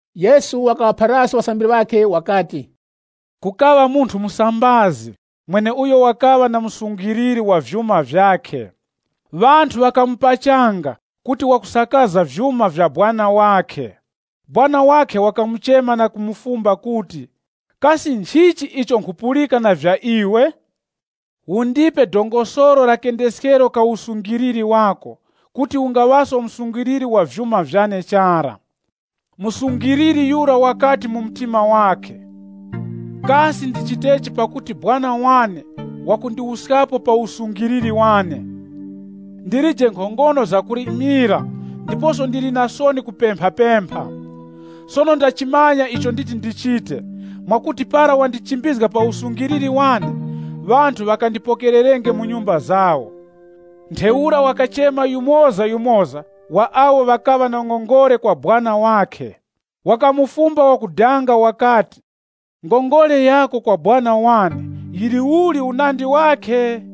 Yesu wakaŵaphaliraso ŵasambiri ŵakhe wakati, “Kukaŵa munthu musambazi, mweneuyo wakaŵa na msungiliri wa vyuma vyakhe. Ŵanthu ŵakamupachanga kuti wakusakaza vyuma vya sekuru wakhe. Sekuru wakhe wakamuchema na kumufumba kuti, ‘Kasi nchichi icho nkhupulika na vya iwe? Undipe karata wa kendeskero ka usungiriri wako, pakuti ungaŵaso msungiliri wa vyuma vyane chara.’ Msungiliri yura wakati mu mtima wakhe, ‘Kasi ndichitechi pakuti sekuru wane wakundiwuskapo pa usungiriri wane? Ndilije nkhongono zakulimira ndiposo ndili na soni kupemphapempha. Sono ndachimanya icho nditi ndichite, mwakuti para ndachimbizgika pa usungiriri wane, ŵanthu ŵakandipokererenge mu nyumba zawo.’ “Ntheura wakachema yumozayumoza wa awo ŵakaŵa na ngongole kwa sekuru wakhe. Wakamufumba wakudanga wakati, ‘Ngongole yako kwa sekuru wane yili uli unandi wakhe?’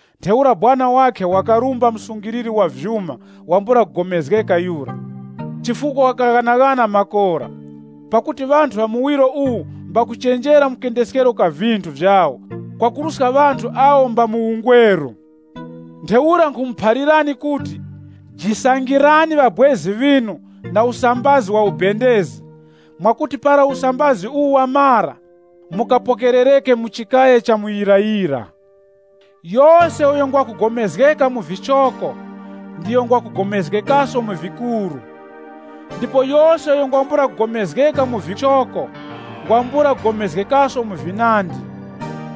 “Ntheura sekuru wakhe wakarumba msungiliri wa vyuma wambula kugomezgeka yura, chifukwa wakaghanaghana makora. Pakuti ŵanthu ŵa muwiro uwu mbakuchenjera mu kendeskero ka vinthu vyawo kwakuruska ŵanthu awo mba mu ungweru. “Ntheura nkhumuphalirani kuti, jisangirani ŵabwezi ŵinu na usambazi wa ubendezi, mwakuti para usambazi uwu wamara, mukapokerereke mu chikaya cha muyirayira. Yose uyo ngwa kugomezgeka mu vichoko, ndiyo ngwa kugomezgekaso mu vikuru. Ndipo yose uyo ngwambula kugomezgeka mu vikuru, ngwambula kugomezgekaso mu vinandi.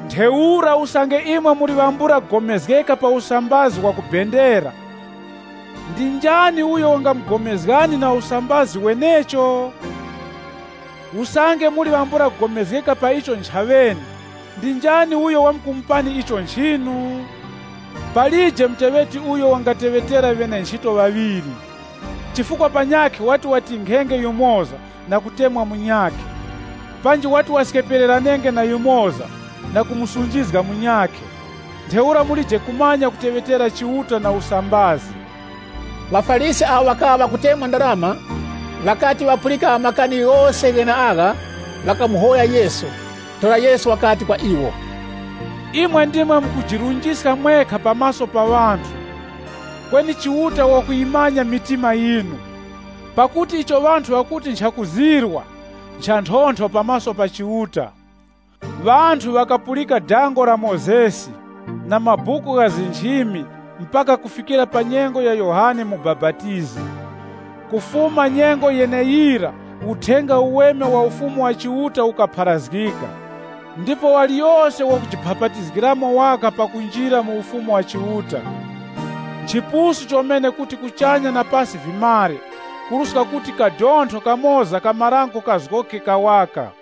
Ntheura usange imwe muli ŵambula kugomezgeka pa usambazi wa kubendera, ndi njani uyo wangamugomezgani na usambazi wenecho? Usange muli ŵambula kugomezgeka pa icho nchaŵene, ndi njani uyo wamkumupani icho nchinu? “Palije muteŵeti uyo wangateŵetera ŵene-nchito ŵaŵiri. Chifukwa panyakhe wati watinkhenge yumoza na kutemwa munyakhe. Panji wati waskepereranenge na yumoza, na kumusunjizga munyakhe. Ntheura mulije kumanya kuteŵetera Chiuta na usambazi.” ŴaFarisi awo ŵakaŵa ŵakutemwa ndarama, ŵakati ŵapulika makani ghose gheneagha, ŵakamuhoya Yesu. Ntheura Yesu wakati kwa iwo, “Imwe ndimwe mukujirunjiska mwekha pa maso pa ŵanthu. Kweni Chiuta wakuyimanya mitima yinu. Pakuti icho ŵanthu ŵakuti nchakuzirwa, nchanthontho pa maso pa Chiuta. “Ŵanthu ŵakapulika dango la Mozesi na mabuku gha nchimi mpaka kufikira pa nyengo ya Yohane Mubapatizi. Kufuma nyengo yeneyira Uthenga Uweme wa Ufumu wa Chiuta ukupharazgika, ndipo yose wakujiphapatizgamo waka pakunjira mu Ufumu wa Chiuta. Nchipusu chomene kuti kuchanya na pasi vimare, kuruska kuti kadontho kamoza ka marango kazgoke kawaka.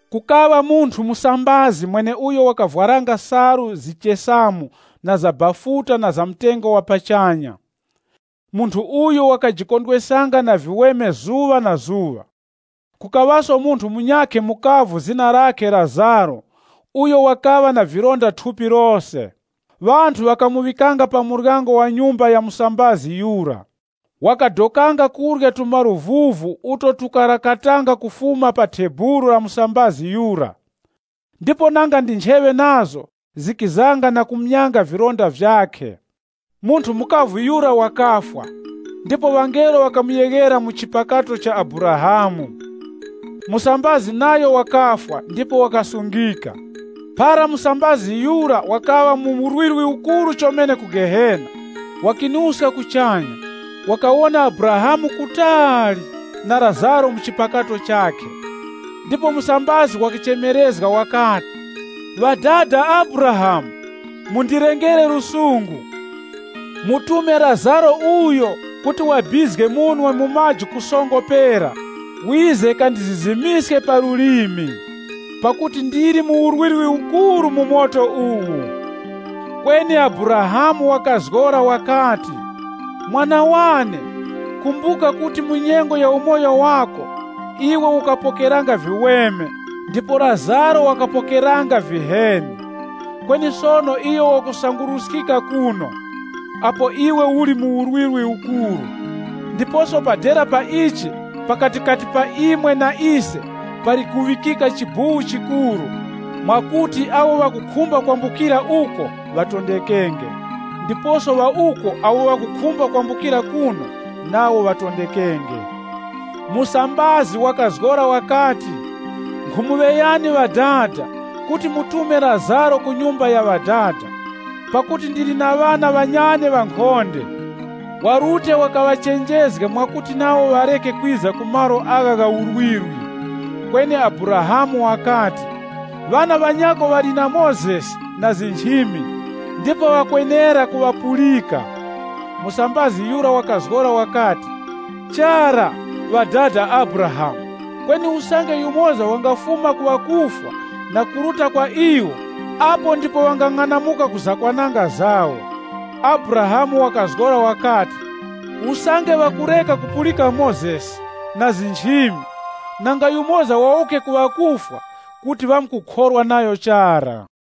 “Kukaŵa munthu musambazi mweneuyo wakavwaranga salu zichesamu na za bafuta na za mtengo wa pachanya. Munthu uyu wakajikondweskanga na viweme zuŵa na zuŵa. Kukaŵaso munthu munyakhe mukavu zina lakhe Lazaro uyo wakaŵa na vilonda thupi lose. Ŵanthu ŵakamuŵikanga pa muryango wa nyumba ya musambazi yura. Wakadokanga kurya tumaluvuvu uto tukarakatanga kufuma pa thebulu la musambazi yura. Ndipo nanga ndi ncheŵe nazo, zikizanga na kumyanga vilonda vyakhe. “Munthu mukavu yura wakafwa, ndipo ŵangelo ŵakamuyeghera mu chipakato cha Abrahamu. Musambazi nayo wakafwa ndipo wakasungika. Para musambazi yura wakaŵa mu urwirwi ukuru chomene ku Gehena, wakalaŵiska kuchanya, wakawona Abrahamu kutali, na Lazaro mu chipakato chakhe. Ndipo musambazi wakachemerezga wakati, ‘Ŵadada Abrahamu, mundilengere lusungu. Mutume Lazaro uyo kuti wabizge munwe mu maji ku songo pera wize kandizizimiske pa lulimi. Pakuti ndili mu urwirwi ukuru wa mu moto uwu!’ Kweni Abrahamu wakazgora wakati, ‘Mwana wane, kumbuka kuti mu nyengo ya umoyo wako, iwe ukapokeranga viweme ndipo Lazaro wakapokeranga viheni. Kweni sono iyo wakusanguruskika kuno, apo iwe uli mu urwirwi ukuru. Ndiposo pa dera pa ichi pakatikati pa imwe na ise, pali kuŵikika chibuwu chikuru, mwakuti awo ŵakukhumba kwambukira kuno nawo ŵatondekenge, ndiposo ŵa uko awo ŵakukhumba kwambukira kuno nawo ŵatondekenge.’ Musambazi wakazgora wakati, ‘Nkhumuŵeyani ŵadada kuti mumutume Lazaro ku nyumba ya ŵadada. Pakuti ndili na ŵana ŵanyane ŵankhonde. Warute wakaŵachenjezge mwakuti nawo ŵareke kwiza mu malo agha gha urwirwi.’ “Kweni Abrahamu wakati, ‘Ŵana ŵanyako ŵali na Mozesi na nchimi, ndipo ŵakwenera kuŵapulika.’ Musambazi yura wakazgora wakati, ‘Chara, ŵadada Abrahamu. Kweni usange yumoza wangafuma ku ŵakufwa na kuruta kwa iwo, apo ndipo ŵangang'anamuka ku zakwananga zawo.’ Abrahamu wakazgora wakati, ‘Usange ŵakureka kupulika Mozesi, na nchimi, nanga yumoza wawuke ku ŵakufwa, kuti ŵamkukhorwa nayo chara.’”